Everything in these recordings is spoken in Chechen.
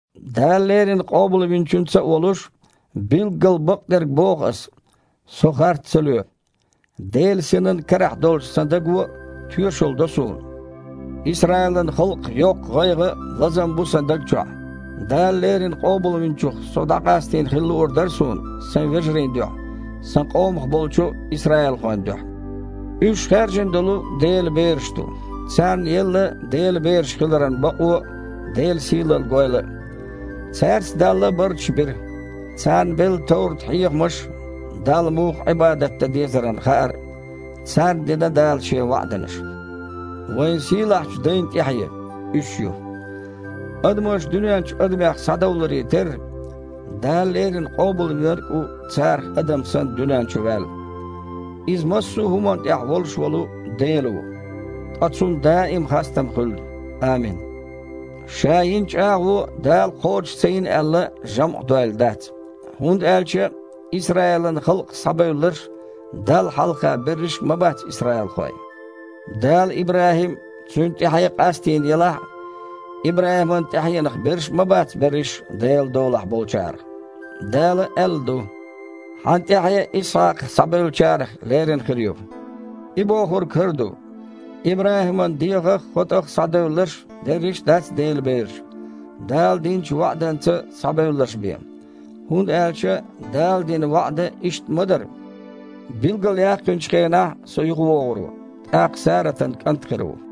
Дала леррина Къобалвинчуьнца а волуш, билггал бакъдерг боху Аса. Со харц ца лоь. Делан Синан карахь долчу сан даго а тоьшалла до суна: Исраилан халкъах йоккха гІайгІа а, лазам а бу сан даг чохь. Дала леррина Къобалвинчух со дІакъастийна хила луур дара суна сайн вежарийн дуьхьа, сан къомах болчу исраилхойн дуьхьа. Уьш хаьржина долу Делан бераш ду. Царна елла Делан бераш хиларан бакъо а, Делан сийлалла гойла а. Цаьрца Дала барташ бира. Царна белла товрат-хьехамаш а, Далла муха Іибадат дан дезаран хаар а. Царна дина Дала Шен ваІданаш. Вайн сийлахьчу дайн тІаьхье – уьш ю. Адамаш дуьнен чу адамех схьадовларе терра, Дала леррина Къобалвинарг а ву царах адам санна дуьнен чу ваьлла. Иза массо а хІуманна тІехь волуш волу Дела ву, ткъа Цунна даим а хастам хуьлда! Амин! Ша йина чІагІо Дала кхочуш ца йина аьлла, жамІ дойла дац, хІунда аьлча Исраилан халкъах схьабевлларш Далла хьалха берриш а ма бац исраилхой. Дала ИбрахІим а, цуьнан тІаьхье а къастийна елахь а, ИбрахІиман тІаьхьенах берш а ма бац берриш а Делан долахь болчарах. Дала аьлла ду: «Хьан тІаьхье Исхьакхах схьабевллачарах лерина хир ю». И бохург хІара ду: ИбрахІиман дегІах а, хотІах а схьадевлларш дерриш а дац Делан бераш, Дала динчу ваІданца схьабевлларш бен. ХІунда аьлча Дала дина ваІда иштта ма дара: «Билгалъяьккхинчу хенахь Со юхавогІур ву, тІаккха Саратан кІант хир ву».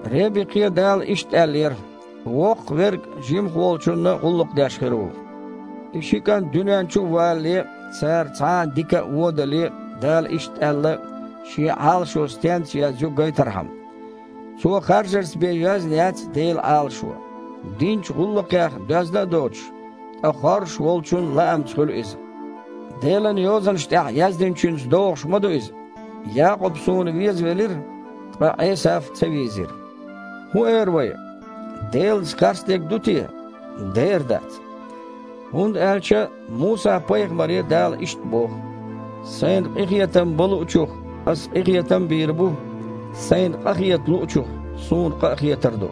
Ребикхе Дала иштта аьллера: «Воккхаха верг жимаха волчунна гІуллакх деш хир ву». И ши кІант дуьнен чу а валале, цара цхьа а дика а, вон а дале, Дала иштта аьлла, Шен Іалашо стенца йоьзна ю гайтархьама. Цо харжарца бен йоьзна яц Делан Іалашо. Динчу гІуллакхех доьзна а доцуш, ткъа хоржуш Волчун лаамца хуьлу иза. Делан Йозанаш тІехь яздинчуьнца догІуш ма ду иза: «Якъуб Суна везавелира, ткъа Іесав ца вийзира». ХІун эр вай? Делаца харцдерг ду те? Дера дац! ХІунда аьлча Муса-пайхамаре Дала иштта боху: «Сайна къинхетам бан луучух Ас къинхетам а бийр бу, Сайна къахета луучух Суна къа а хетар ду».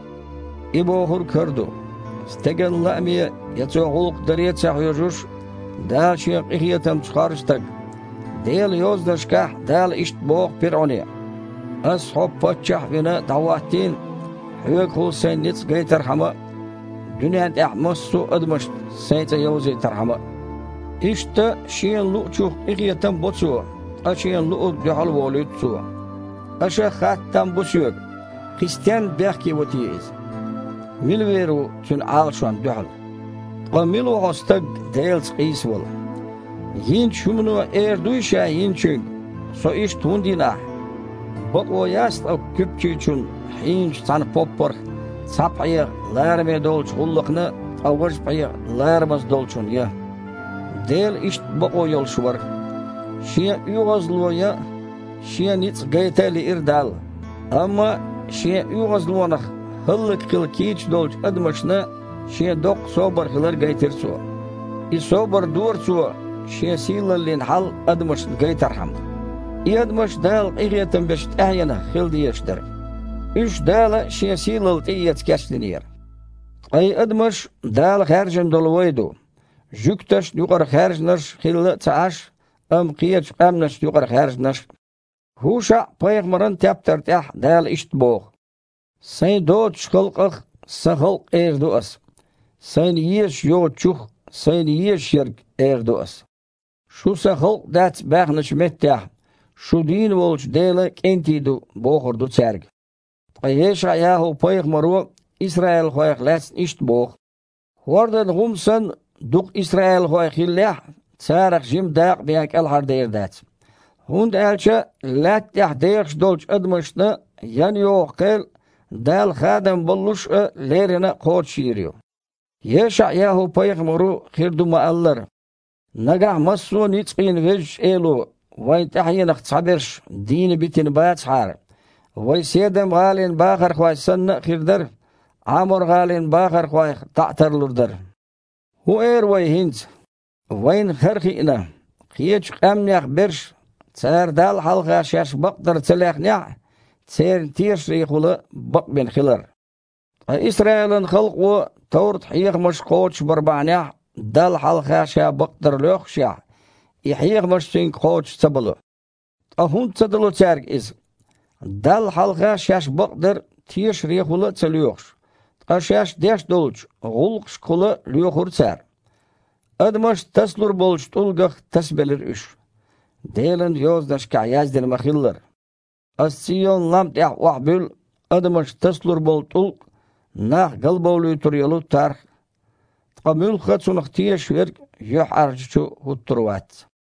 И бохург хІара ду: стеган лааме я цо гІуллакх даре а ца хьоьжуш, Дала Шен къинхетамца хоржу стаг. Делан Йозанашкахь Дала иштта боху пирІуне: «Аса хьо, паччахь а вина, дІахІоттийна, хьоьгахула Сайн ницкъ гайтархьама а, дуьнен тІехь массо а адамашна Сайн цІе йовзийтархьама а». Иштта Шена луъучух къинхетам а бо Цо, ткъа Шена луъург дуьхьал а волуьйту Цо. Аша хатта там бу соьга: «Кхин стенна бехке во те Иза? Мила вер ву Цуьнан Іалашонна дуьхьал?» Ткъа мила ву хьо, стаг, Делаца къийсавала? Йинчу хІумано эр дуй ша йиначуьнга: «Со иштта хІунда йина ахьа?» Бакъо яц ткъа куьпчичун хьийначу цхьана поппарх цхьа пхьегІа лараме долчу гІуллакхна, ткъа важа пхьегІа ларамаза долчунна ян? Дела иштта бакъо йолуш вара. Шен оьгІазло ян а, Шен ницкъ гайта а лиира Далла, амма Шен оьгІазлонах хІаллакьхила кийча долчу адамашна Шен доккха собар хилар гайтира Цо. И собар дора Цо, Шен сийлаллин хьал адамашна гайтархьама. И адамаш Дала къинхетам бечу тІаьхьенах хила дезаш дара. Уьш Дала Шен сийлалла тІеэца кечдинера. Ткъа и адамаш Дала хаьржина долу вай ду – жуьгташна юкъара хаьржинарш хилла а ца Іаш, амма кхечу къаьмнашна юкъара хаьржинарш а. ХІушаІ-пайхамаран тептар тІехь Дала иштта боху: «Сайн доцучу халкъах – „Сан халкъ“ эр ду Аса, Сайна езаш йоцучух а – „Сайна езаш ерг“ эр ду Аса. „Шу сан халкъ дац“ – баьхначу меттехь, „Шу дийна волчу Делан кІентий ду“, – бохур ду цаьрга». Ткъа ЕшаІ-ЯхІу-пайхамаро исраилхойх лаьцна иштта боху: «ХІордан гІум санна, дукха исраилхой хиллехь а, царах жима дакъа бен кІелхьардер дац. ХІунда аьлча лаьтта тІехь дехаш долчу адамашна ян йогІу кхел Дала хадам боллуш а, леррина а кхочушйийр ю». ЕшаІ-ЯхІу-пайхамаро хир ду ма-аллара: «Нагахь массо а ницкъийн Везачу Эло вайн тІаьхьенах цхьаберш дийна битина бацахьара, вай Седам-гІалин бахархой санна а хир дара, Іамор-гІалин бахархойх дІа а тарлур дара». ХІун эр вай хІинца? Вайна хІара хиъна: кхечу къаьмнех берш, цара Далла хьалха шаьш бакъдар ца лехнехь а, церан тешарехула бакъбина хилар. Ткъа Исраилан халкъо товрат-хьехамаш кхочушбар бахьанехь Далла хьалха ша бакъдар лоьххушехь, и хьехамаш цуьнга кхочуш ца бало. Ткъа хІунда ца дало цаьрга иза? Далла хьалха шаьш бакъдар тешарехула а ца лоьхуш, ткъа шаьш деш долчу гІуллакхашкахула лоьхура цара. «Адамаш тасалур болчу тІулгах» тасабелира уьш, Делан Йозанашкахь яздина ма-хиллара: «Ас Цийон-лам тІехь охьабуьллу адамаш тасалур болу тІулг а, нах галбовлуьйтур йолу тарх а. Ткъа муьлхха а Цунах тешаш верг юьхьІаьржачу хІуттур вац».